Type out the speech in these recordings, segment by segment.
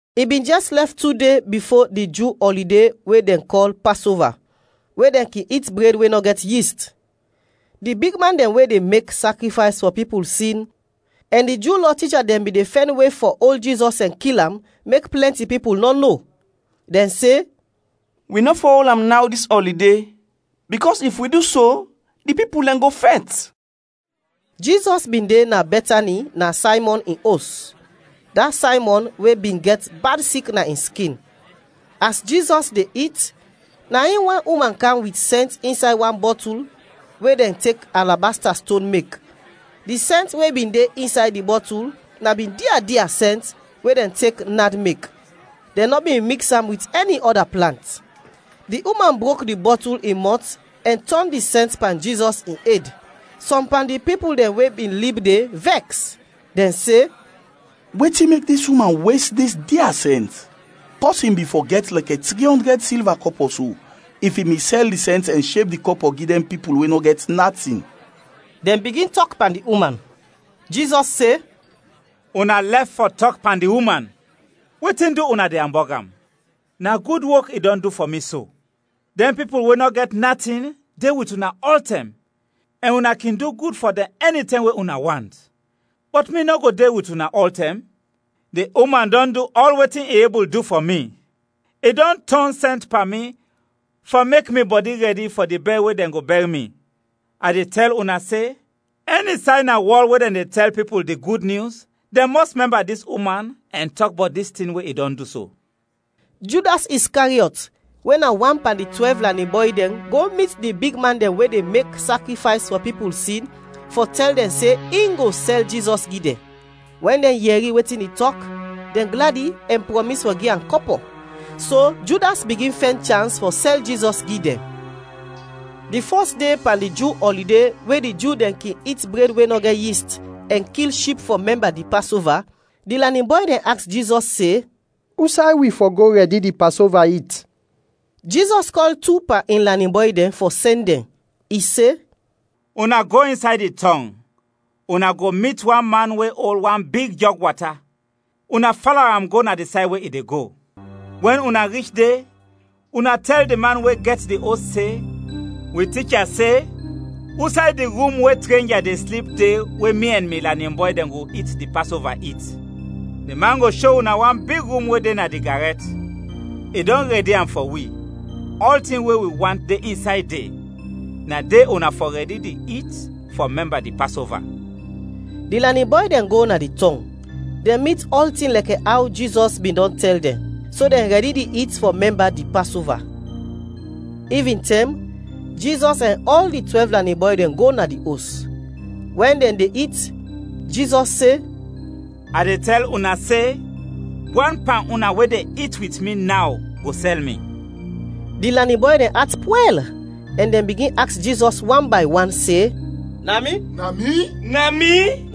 I bin jɛs lɛf tu de bifo di Ju ɔlide we dɛn kɔl Pasova, we dɛn kin it bred we nɔ gɛt yist. Di bigman dɛn we de mek sakrifays fɔ pipul sin ɛn di Ju Lɔ ticha dɛn bin de fɛn we fɔ ol Jizɔs ɛn kil am, mek plɛnti pipul nɔ no. Dɛn se, “Wi nɔ fɔ ol am naw dis ɔlide, bikɔs if wi du so, di pipul dɛn go fɛt.” Jizɔs bin de na Bɛtani na Saymɔn in os, da Saymɔn we bin gɛt bad sik na in skin. As Jizɔs de it, na in wan uman kam wit sɛnt insay wan bɔtul we dɛn tek alabasta ston mek. Di sɛnt we bin de insay di bɔtul na bin dia dia sɛnt we dɛn tek nad mek, dɛn nɔ bin miks am wit ɛni ɔda plant. Di uman brok di bɔtul in mɔt ɛn tɔn di sɛnt pan Jizɔs in ed. Sɔm pan di pipul dɛn we bin lib de vɛks, dɛn se, “Wetin mek dis uman wes dis dia sɛnt? Pɔsin bin fɔ gɛt lɛkɛ tri ɔndrɛd silva kɔpɔ so, if i bin sɛl di sɛnt ɛn sheb di kɔpɔ gi dɛn pipul we nɔ gɛt natin.” Dɛn bigin tɔk pan di uman. Jizɔs se, “Una lɛf fɔ tɔk pan di uman! Wetin du una de ambɔg am? Na gud wok i dɔn du fɔ mi so! Dɛn pipul we nɔ gɛt natin de wit una ɔltɛm, ɛn una kin du gud fɔ dɛn ɛnitɛm we una want. Bɔt mi nɔ go de wit una ɔltɛm. Di uman dɔn du ɔl wetin i ebul du fɔ mi, i dɔn tɔn sɛnt pan mi fɔ mek mi bɔdi rɛdi fɔ di bɛr we dɛn go bɛr mi. A de tɛl una se, ɛni say na wɔl we dɛn de tɛl pipul di Gud Nyus, dɛn mɔs mɛmba dis uman ɛn tɔk bɔt dis tin we i dɔn du so.” Judas Iskariɔt we na wan pan di twɛlv lanin bɔy dɛn go mit di bigman dɛn we de mek sakrifays fɔ pipul sin fɔ tɛl dɛn se in go sɛl Jizɔs gi dɛn. Wɛn dɛn yɛri wetin i tɔk, dɛn gladi ɛn prɔmis fɔ gi am kɔpɔ. So Judas bigin fɛn chans fɔ sɛl Jizɔs gi dɛn. Di fɔs de pan di Ju ɔlide we di Ju dɛn kin it bred we nɔ gɛt yist, ɛn kil ship fɔ mɛmba di Pasova, di lanin bɔy dɛn aks Jizɔs se, “Usay wi fɔ go rɛdi di Pasova it?” Jizɔs kɔl tu pan in lanin bɔy dɛn fɔ sɛn dɛn, i se, “Una go insay di tɔng, una go mit wan man we ol wan big jɔg wata, una fala am go na di say we i de go. Wɛn una rich de, una tɛl di man we gɛt di os se, ‘Wi Ticha se, usay di rum we trenja de slip de we mi ɛn mi lanin bɔy dɛn go it di Pasova it?’ Di man go sho una wan big rum we de na di garɛt. I dɔn rɛdi am fɔ wi, ɔltin we wi want de insay de, na de una fɔ rɛdi di it fɔ mɛmba di Pasova.” Di lanin bɔy dɛn go na di tɔng, dɛn mit ɔltin lɛkɛ aw Jizɔs bin dɔn tɛl dɛn; so dɛn rɛdi di it fɔ mɛmba di Pasova. Ivintɛm, Jizɔs ɛn ɔl di twɛlv lanin bɔy dɛn go na di os. Wɛn dɛn de it, Jizɔs se, “A de tɛl una se, wan pan una we de it wit mi naw go sɛl mi.” Di lanin bɔy dɛn at pwɛl ɛn dɛn bigin aks Jizɔs wan bay wan se, “Na mi? Na mi?”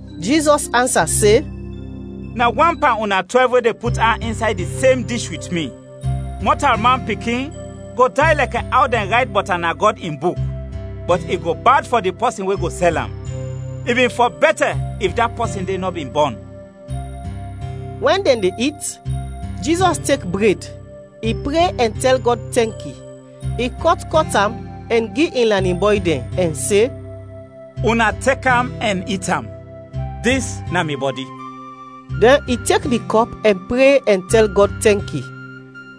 Jizɔs ansa se, “Na wan pan una twɛlv we de put an insay di sem dish wit mi. Mɔtalman Pikin go day lɛkɛ aw dɛn rayt bɔt am na Gɔd in Buk; bɔt i go bad fɔ di pɔsin we go sɛl am. I bin fɔ bɛtɛ if da pɔsin de nɔ bin bɔn!” Wɛn dɛn de it, Jizɔs tek bred, i pre ɛn tɛl Gɔd tɛnki. I kɔt kɔt am ɛn gi in lanin bɔy dɛn ɛn se, “Una tek am ɛn it am, dis na mi bɔdi.” Dɛn i tek di kɔp ɛn pre ɛn tɛl Gɔd tɛnki.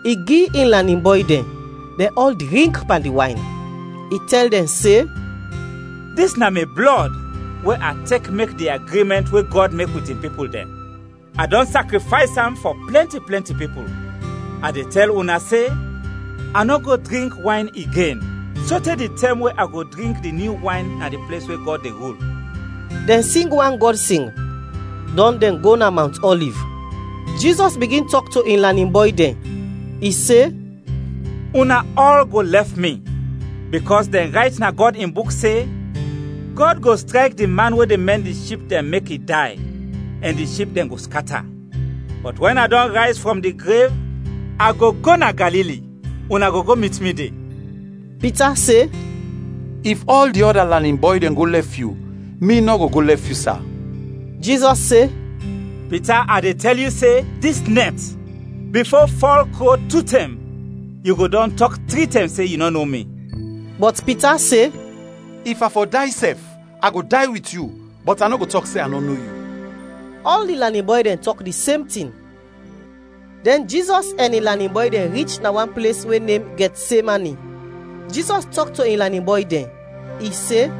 I gi in lanin bɔy dɛn; dɛn ɔl drink pan di wayn. I tɛl dɛn se, “Dis na mi blɔd we a tek mek di agrimɛnt we Gɔd mek wit in pipul dɛn. A dɔn sakrifays am fɔ plɛnti plɛnti pipul. A de tɛl una se, a nɔ go drink wayn igen sote di tɛm we a go drink di nyu wayn na di ples we Gɔd de rul.” Dɛn sing wan Gɔd sing, dɔn dɛn go na Mawnt Ɔliv. Jizɔs bigin tɔk to in lanin bɔy dɛn, i se, “Una ɔl go lɛf mi; bikɔs dɛn rayt na Gɔd in Buk se, ‘Gɔd go strayk di man we de mɛn di ship dɛn mek i day, ɛn di ship dɛn go skata.’ Bɔt wɛn a dɔn rayz frɔm di grev, a go go na Galili, una go go mit mi de.” Pita se, “If ɔl di ɔda lanin bɔy dɛn go lɛf yu, mi nɔ go go lɛf yu, sa!” Jizɔs se, “Pita, a de tɛl yu se, dis nɛt, bifo fɔl kro tu tɛm, yu go dɔn tɔk tri tɛm se yu nɔ no mi.” Bɔt Pita se, “If a fɔ day sɛf, a go day wit yu, bɔt a nɔ go tɔk se a nɔ no yu!” Ɔl di lanin bɔy dɛn tɔk di sem tin. Dɛn Jizɔs ɛn in lanin bɔy dɛn rich na wan ples we nem Gɛtsemani. Jizɔs tɔk to in lanin bɔy dɛn, i se,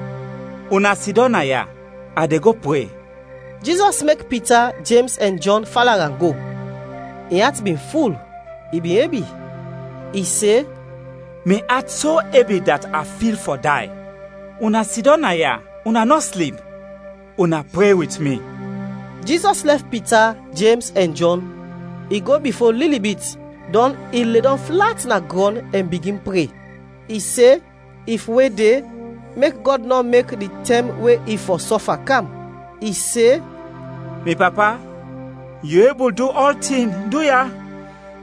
“Una sidɔm naya, a de go pre.” Jizɔs mek Pita, Jems ɛn Jɔn fala am go. In at bin ful, i bin ebi. I se, “Mi at so ebi dat a fil fɔ day. Una sidɔm naya, una nɔ slip, una pre wit mi.” Jizɔs lɛf Pita, Jems ɛn Jɔn, i go bifo lili bit, dɔn i ledɔm flat na grɔn ɛn bigin pre. I se, if we de, mek Gɔd nɔ mek di tɛm we i fɔ sɔfa kam. I se, “Mi Papa, yu ebul du ɔltin, duya,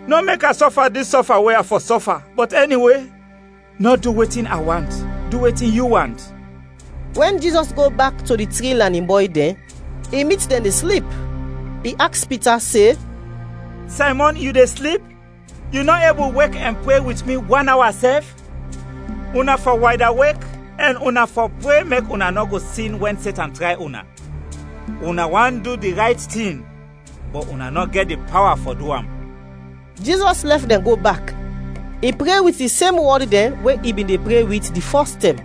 nɔ mek a sɔfa dis sɔfa we a fɔ sɔfa, bɔt ɛniwe, nɔ du wetin a want, du wetin yu want.” Wɛn Jizɔs go bak to di tri lanin bɔy dɛn, i mit dɛn de slip. I aks Pita se, “Saymɔn, yu de slip? Yu nɔ ebul wek ɛn pre wit mi wan awa sɛf? Una fɔ waydawek ɛn una fɔ pre mek una nɔ go sin wɛn Setan tray una. Una want du di rayt tin, bɔt una nɔ gɛt di pawa fɔ du am.” Jizɔs lɛf dɛn go bak, i pre wit di sem wɔd dɛn we i bin pre wit di fɔs tɛm.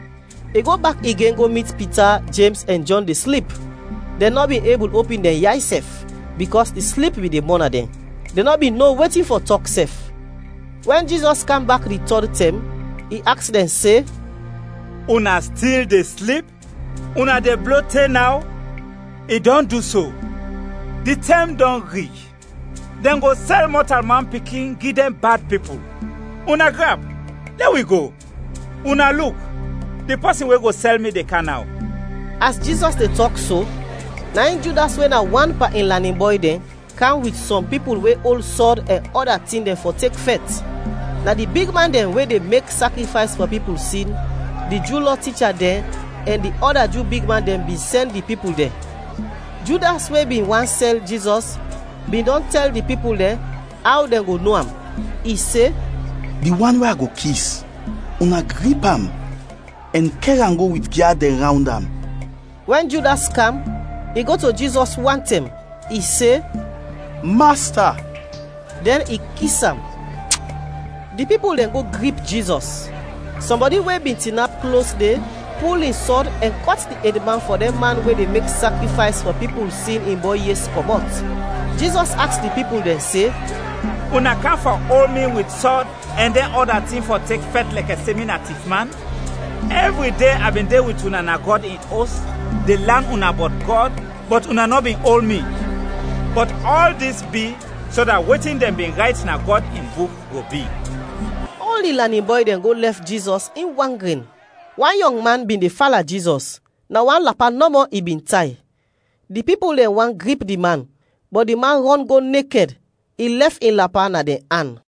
I go bak igen go mit Pita, Jems ɛn Jɔn de slip, dɛn nɔ bin ebul opin dɛn yay sɛf, bikɔs di slip bin de mɔna dɛn. Dɛn nɔ bin no wetin fɔ tɔk sɛf. Wɛn Jizɔs kam bak di tɔd tɛm, i aks dɛn se, “Una stil de slip, una de blo te naw? I dɔn du so! Di tɛm dɔn rich; dɛn go sɛl Mɔtalman Pikin gi dɛn bad pipul. Una grap, lɛ wi go; una luk, di pɔsin we go sɛl mi de kam naw!” As Jizɔs de tɔk so, na in Judas we na wan pan in lanin bɔy dɛn kam wit sɔm pipul we ol sɔd ɛn ɔda tin dɛn fɔ tek fɛt. Na di bigman dɛn we de mek sakrifays fɔ pipul sin, di Ju Lɔ ticha dɛn, ɛn di ɔda Ju bigman dɛn bin sɛn di pipul dɛn. Judas we bin want sɛl Jizɔs bin dɔn tɛl di pipul dɛn aw dɛn go no am. I se, “Di wan we a go kis, una grip am ɛn kɛr am go wit gyad dɛn rawnd am.” Wɛn Judas kam, i go to Jizɔs wantɛm, i se, “Masta!” Dɛn i kis am. Di pipul dɛn go grip Jizɔs. Sɔmbɔdi we bin tinap klos de pul in sɔd ɛn kɔt di edman fɔ dɛn man we de mek sakrifays fɔ pipul sin in bɔy yes kɔmɔt. Jizɔs aks di pipul dɛn se, “Una kam fɔ ol mi wit sɔd ɛn dɛn ɔda tin fɔ tek fɛt lɛkɛ se mi na tifman? Ɛvri de bin de wit una na Gɔd in Os de lan una bɔt Gɔd, bɔt una nɔ bin ol mi. Bɔt ɔl dis bi so dat wetin dɛn bin rayt na Gɔd in Buk go bi.” Ɔl di lanin bɔy dɛn go lɛf Jizɔs in wan gren. Wan yɔngman bin de fala Jizɔs, na wan lapa nɔmɔ i bin tay. Di pipul dɛn want grip di man, bɔt di man rɔn go nekɛd; i lɛf in lapa na dɛn an.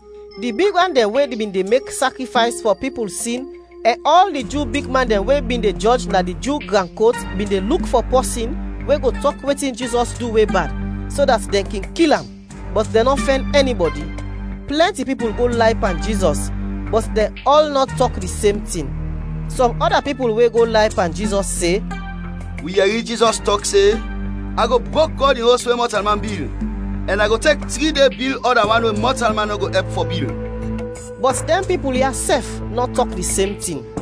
Di bigman dɛn we bin de mek sakrifays fɔ pipul sin ɛn ɔl di Ju bigman dɛn we bin de jɔj na di Ju gran kot bin de luk fɔ pɔsin we go tɔk wetin Jizɔs du we bad, so dat dɛn kin kil am, bɔt dɛn nɔ fɛn ɛnibɔdi. Plɛnti pipul go lay pan Jizɔs, bɔt dɛn ɔl nɔ tɔk di sem tin. Sɔm ɔda pipul we go lay pan Jizɔs, se, “Wi yɛri Jizɔs tɔk se, ‘A go brok Gɔd in Os we mɔtalman bil, ɛn a go tek tri de bil ɔda wan we mɔtalman nɔ go ɛp fɔ bil.’” Bɔt dɛn pipul ya sɛf nɔ tɔk di sem tin.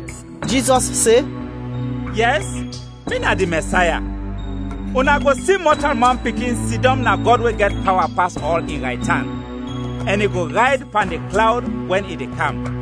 Jizɔs se, “Yɛs, mi na di Mɛsaya. Una go si Mɔtalman Pikin sidɔm na Gɔd we gɛt pawa pas ɔl, in raytan, ɛn i go rayd pan di klawd wɛn i de kam!”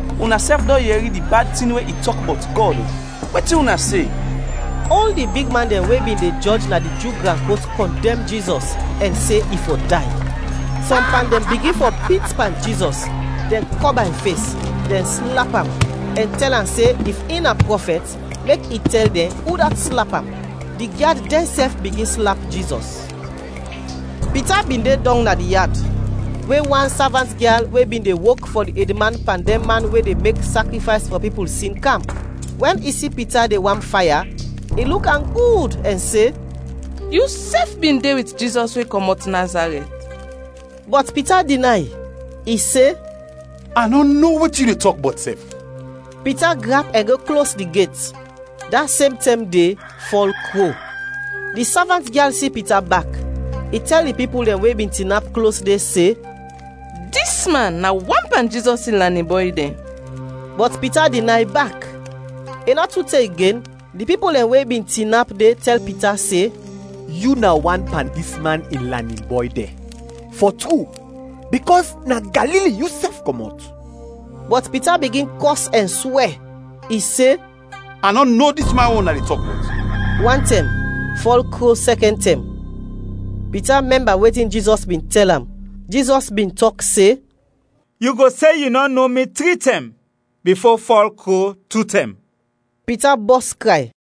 Unasɛf dɔn yɛri di bad tin we i tɔk bɔt Gɔd, wetin una se?” Ɔl di bigman dɛn we bin de jɔj na di Ju gran kot kɔndɛm Jizɔs ɛn se i fɔ day. Sɔm pan dɛn bigin fɔ pit pan Jizɔs; dɛn kɔba in fes, dɛn slap am, ɛn tɛl am se if in na prɔfɛt mek i tɛl dɛn udat slap am. Di gyad dɛnsɛf bigin slap Jizɔs. Pita bin de dɔng na di yad we wan savant-gyal we bin de wok fɔ di edman pan dɛn man we de mek sakrifays fɔ pipul sin, kam. Wɛn i si Pita de wam faya, i luk am gud ɛn se, “Yusɛf bin de wit Jizɔs we kɔmɔt Nazarɛt!” Bɔt Pita dinay, i se, “A nɔ no wetin yu de tɔk bɔt sɛf.” Pita grap ɛn go klos di get. [Da sem tɛm de fɔl kro.] Di savant-gyal si Pita bak, i tɛl di pipul dɛn we bin tinap klos de, se, “Dis man na wan pan Jizɔs in lanin bɔy dɛn!” Bɔt Pita dinay bak. I nɔ tu te igen, di pipul dɛn we bin tinap de tɛl Pita se, “Yu na wan pan dis man in lanin bɔy dɛn, fɔ tru, bikɔs na Galili yusɛf kɔmɔt.” Bɔt Pita bigin kɔs ɛn swɛ. I se, “A nɔ no dis man we una de tɔk bɔt!” Wantɛm, fɔl kro sɛkɛn tɛm. Pita mɛmba wetin Jizɔs bin tɛl am. Jizɔs bin tɔk se, “Yu go se yu nɔ no mi tri tɛm bifo fɔl kro tu tɛm.” Pita bɔs kray.